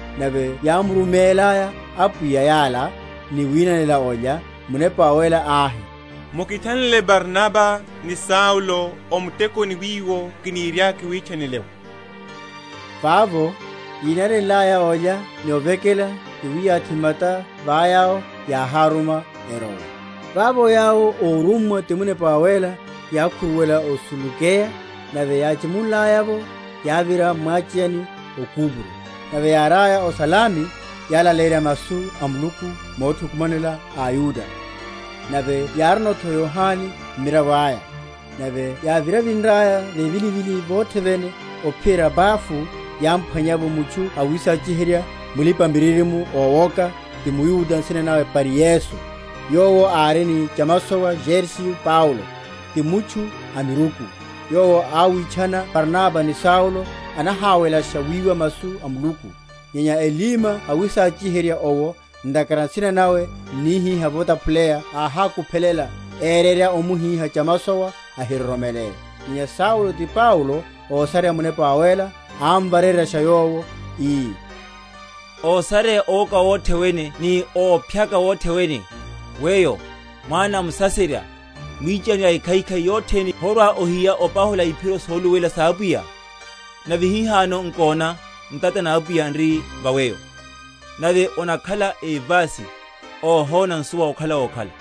Nave yámurumelaya Apwiya yala, ni winanela olya, Munepa Wawéla áhi, Mukithanlele Barnaba ni Saulo o mutekoni wiwo kiniriaka kiwitchanele’wo. Vavo, yínanenlaya olya ni ovekela ni wiyathi mata va yawo, yáháruma erowe. Vavo yawo, órummwa ti Munepa Wawéla, yákhuruwela o Selukeya; nave yáchimunlaya’vo yávira m’mwacheyani o Kupro. Nave yáriaya o Salami, yálaleyerya masu a Muluku mothukumanela aYuda; nave yárino’tho Yohane mmiravo aya. Nave yávinrevinraya vevilivilini vothe vene ophiyerya Pafo, yámphwanya’vo mutchu awisachiherya, mulipa‐miririmo ówoka, ti mYuda, nsina nawe Baryesu; yowo ári ni chamasowa Sergio Paulo, ti mutchu a miruku. Yowo áwitchana Barnaba ni Saulo, anaháwelasha wiwa masu a Muluku. Nyenya Elima awísachiherya owo (ntakhara nsina nawe n’nihiha votaphuleya) áhákuphelela, érerya omuhíha chamasowa ahiroromele. Nyenya Saulo, ti Paulo, ósareya Munepa Wawéla, ámvareryasha yowo, ii, Ósareya owoka wothe wene ni óphyaka wothe wene, weyo, mwana a Musaserya, mwichani a ekhaikhai yothene, horwa‐ohiya opahula iphiro soluluwela sa Apwiya? Nave hihano, nkona, ntata na Apwiya n’ri va weyo, nave onakhala évasi, óhona nsuwa okhala wokhala.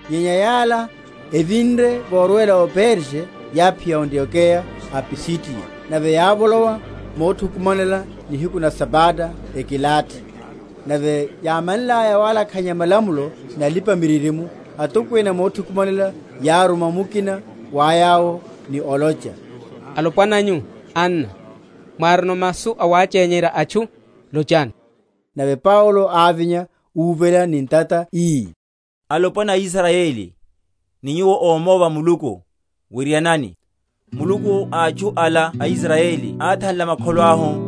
Nyenya yala, evinre vorwela o Perge yáphiya o Antiokeya a m’Pisidiya; nave yávolowa mothukumanela nihiku na Sabata, ekilathi. Nave yámanlaya walakhanya malamulo ni alipa‐miririmo, atokwene a mothukumanela yáruma mukina wa yawo, ni olocha, Alopwana nyu, anna, mwárino masu awachenyerya atchu, lochani. Nave Paulo ávinya, úvela ni ntata ii, Alopwana a Israyeli, ni nyuwo ómóva Muluku, wirianani. Muluku a atchu ala Israyeli áthanla makholo ahu,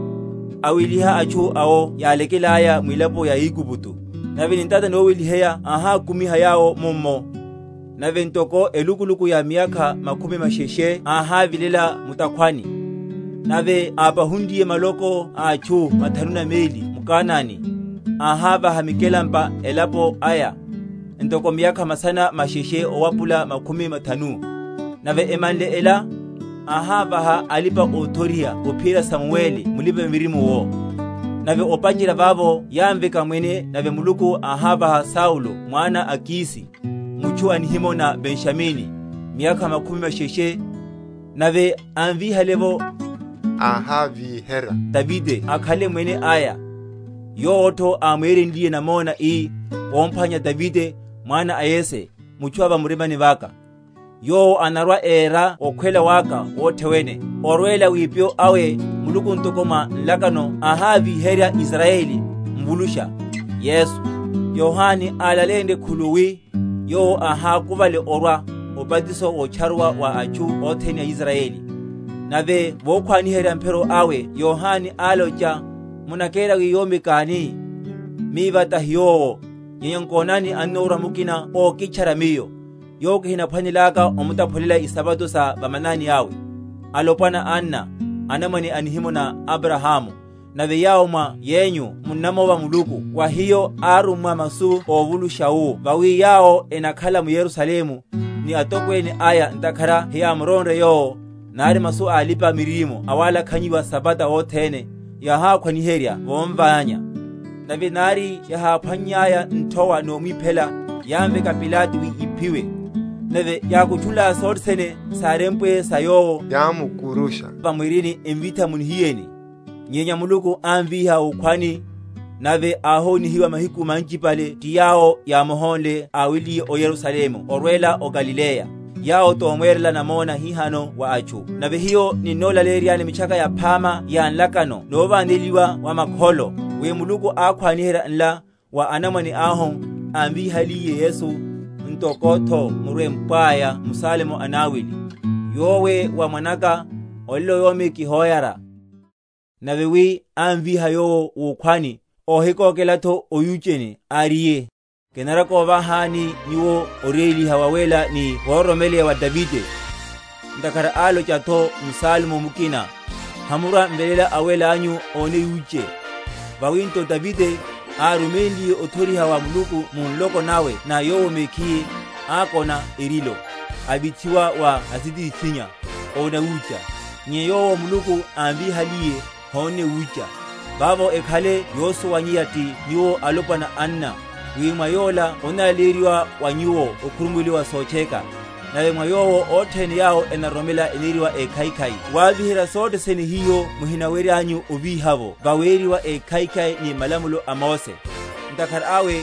aweliha atchu awo yálekelaya mwilaponi ya Aigupto, nave ni ntata noweliheya áhákumiha yawo mummo. Nave ntoko elukuluku ya miyakha makhumi masheshe áhavilelano mu’takhwani. Nave ápahunliye maloko a atchu mathanu na meli m’Kanani, áhávaha mikelampa elapo aya, ntoko miyakha masana masheshe owapula makhumi mathanu; nave emanle ela, áhávaha alipa‐othoriha ophiyerya Samueli mulipa‐miririmo’wo. Nave opacherya vavo yámveka mwene; nave Muluku áhávaha Saulo mwana a Kisi, mutchu a nihimo na Benjamini, miyakha makhumi masheshe. Nave ámvíhale’vo, áhávíherya Davide akhale mwene aya; yowo’tho ámwerenliye namona, ii, Komphwanya Davide, mwana a Yese, mutchu a va murimani vaka, yowo anarwa‐era okhwela waka wothe wene. Orwela wipyo awe Muluku ntoko mwa nlakano áhavíherya Israyeli Mvulusha, Yesu; Yohane alaleyenrye khuluwi, Yowo ahákuvale orwa, obatiso wotcharuwa wa atchu othene a Israyeli. Nave vokhwaniherya mphiro awe Yohane, álocha, Munakera wi yomi káni? Miva tahi yowo. Nyenya nkonani, annorwa mukina ókitchara miyo, yowo kihinaphwanelaka omutaphulela isapato sa va manani awe. Alopwana, anna, anamwane a nihimo na Abrahamu, nave yawo mwa yenyu munamova Muluku, wa hiyo árummwa masu óvulusha wu Vawi yawo enakhala m’Yerusalemu, ni atokwene aya ntakhara heyámuronre Yowo, nari masu a alipa‐miririmo awalakhanyiwa asabata othene, yáhakhwaniherya vomványa. Nave nari yaháphwannyaya nthowa nomwiphela, yámveka Pilato wi íphiwe. Nave yákutchunlaya sothe sene sárempwe sa Yowo, yámkurusha va mwirini, emvitha mu nihiyeni. Nyenya Muluku ámvíha wukhwani; nave áhoniwa mahiku manchipale ti yawo yámuhónle áweliye o Yerusalemu orwela o Galileya, yawo tomwerela namona hihano wa atchu. Nave hiyo ninnolaleyeryani Mitchaka Yaphama ya nlakano novaneliwa wa makholo; wi Muluku ákhwaniherya nla wa anamwane ahu, ámvíhaliye Yesu; ntoko’tho murempwaya m’Salmo anawili, Yowe wá Mwana’ka, Olelo Yomi kihoyara. Nave wi ámvíha Yowo wukhwani, óhikokela’tho oyucheni, áriye, Kinarwa‐kovahani nyuwo oréliha wawéla ni woro?-?romeleya wa Davide. Ntakhara álocha’tho m’Salmo mukina, Hamurwa‐m’veléla Awéla anyu óne yuche. Vawi nto, Davide, áruménliye othoriha wa Muluku mu nloko nawe na yowo mekhiye, ákona erilo, avithiwa wa asitithinnya, óna wucha: nyenya Yowo Muluku ámvíhaliye hónne wucha. Vavo ekhale yosuwanyeya ti nyuwo alopwana anna, wi mwa Yola onnalaleyeryiwa wa nyuwo okhurumuweliwa wa sotcheka: nave mwa Yowo, othene yawo enaroromela eneriwa ékhaikhai wavíherya sothe sene hiho muhinaweryanyu ovíha’vo vaweriwa ékhaikhai ni malamulo a Mose. Ntakhara awe,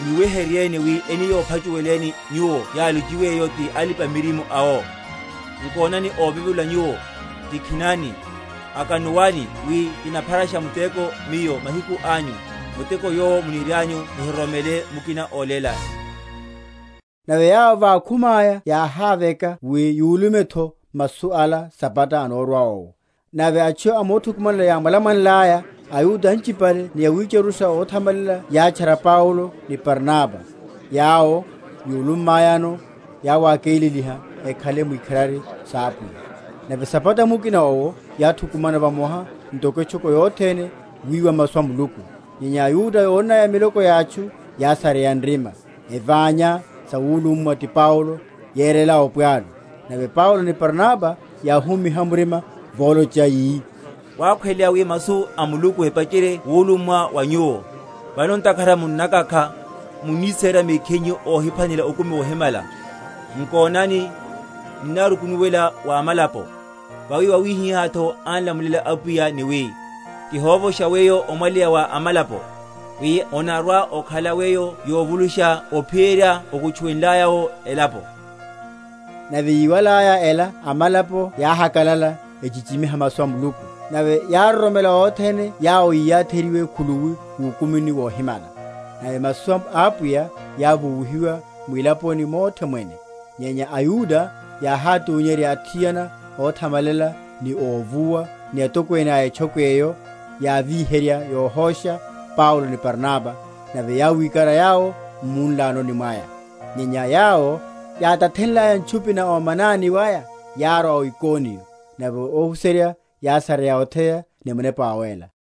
mwiweheryeni, wi eni yophachuweleni nyuwo yálochiwe’yo ti alipa‐miririmo awo: Nkonani, óvevula nyuwo, tikhinani, akanuwani; Wi kinapharasha muteko Miyo mahiku anyu, Muteko yowo munirianyu muhiroromele mukina ólélani. Nave yawo vákhumaya yáháveka wi yulumeno’tho masu ala Sabata anórwa owo. Nave atchu a mothukumanela yámwalamwanlaya, aYuda anchipale ni awitcharusha óthamalela yátchara Paulo ni Barnaba; yawo, yúlummayano, yáwákeleliha ekhale mwikharari sa Apwiya. Nave Sabata mukina owo yáthukumana vamoha ntoko etchoko yothene wiwa masu a Muluku. Nyenya aYuda yónnaya miloko ya atchu yásareya nrima, eványa sawulummwa ti Paulo, yerela opwalu. Nave Paulo ni Barnaba yáhumiha murima volocha, yi, Wákhweleya wi masu a Muluku epacherye wulummwa wa nyuwo. Vano ntakhara munnakakha, muniséra mekhinyu ohiphwanela okumi wohimala, nkonani, ninnarukunuwela wa amalapo. Vawi wawihiha án’lamulela Apwiya ni wi, Kihovosha weyo omwaleya wa amalapo, Wi onarwa‐okhala weyo yovulusha ophiyerya okutchuwenlaya’wo elapo. Nave yíwalaya ela amalapo yáhakalala echichimiha masu a Muluku: nave yároromela othene yawo yiyatheryiwe khuluwi wukumini wohimala. Nave masu a Apwiya yávuwihiwa mwilaponi mothe mwene. Nyenya aYuda yáhátunyerya athiana óthamalela ni óvuwa, ni atokwene a etchoko eyo, yávíherya yohosha Paulo ni Barnaba, nave yáwikara yawo m’munlanoni mwaya. Nyenya yawo, yátathenlaya ntchupi na omanani waya yárwa o Ikoniyo. Nave ohuserya yásareya otheya ni Munepa Wawéla.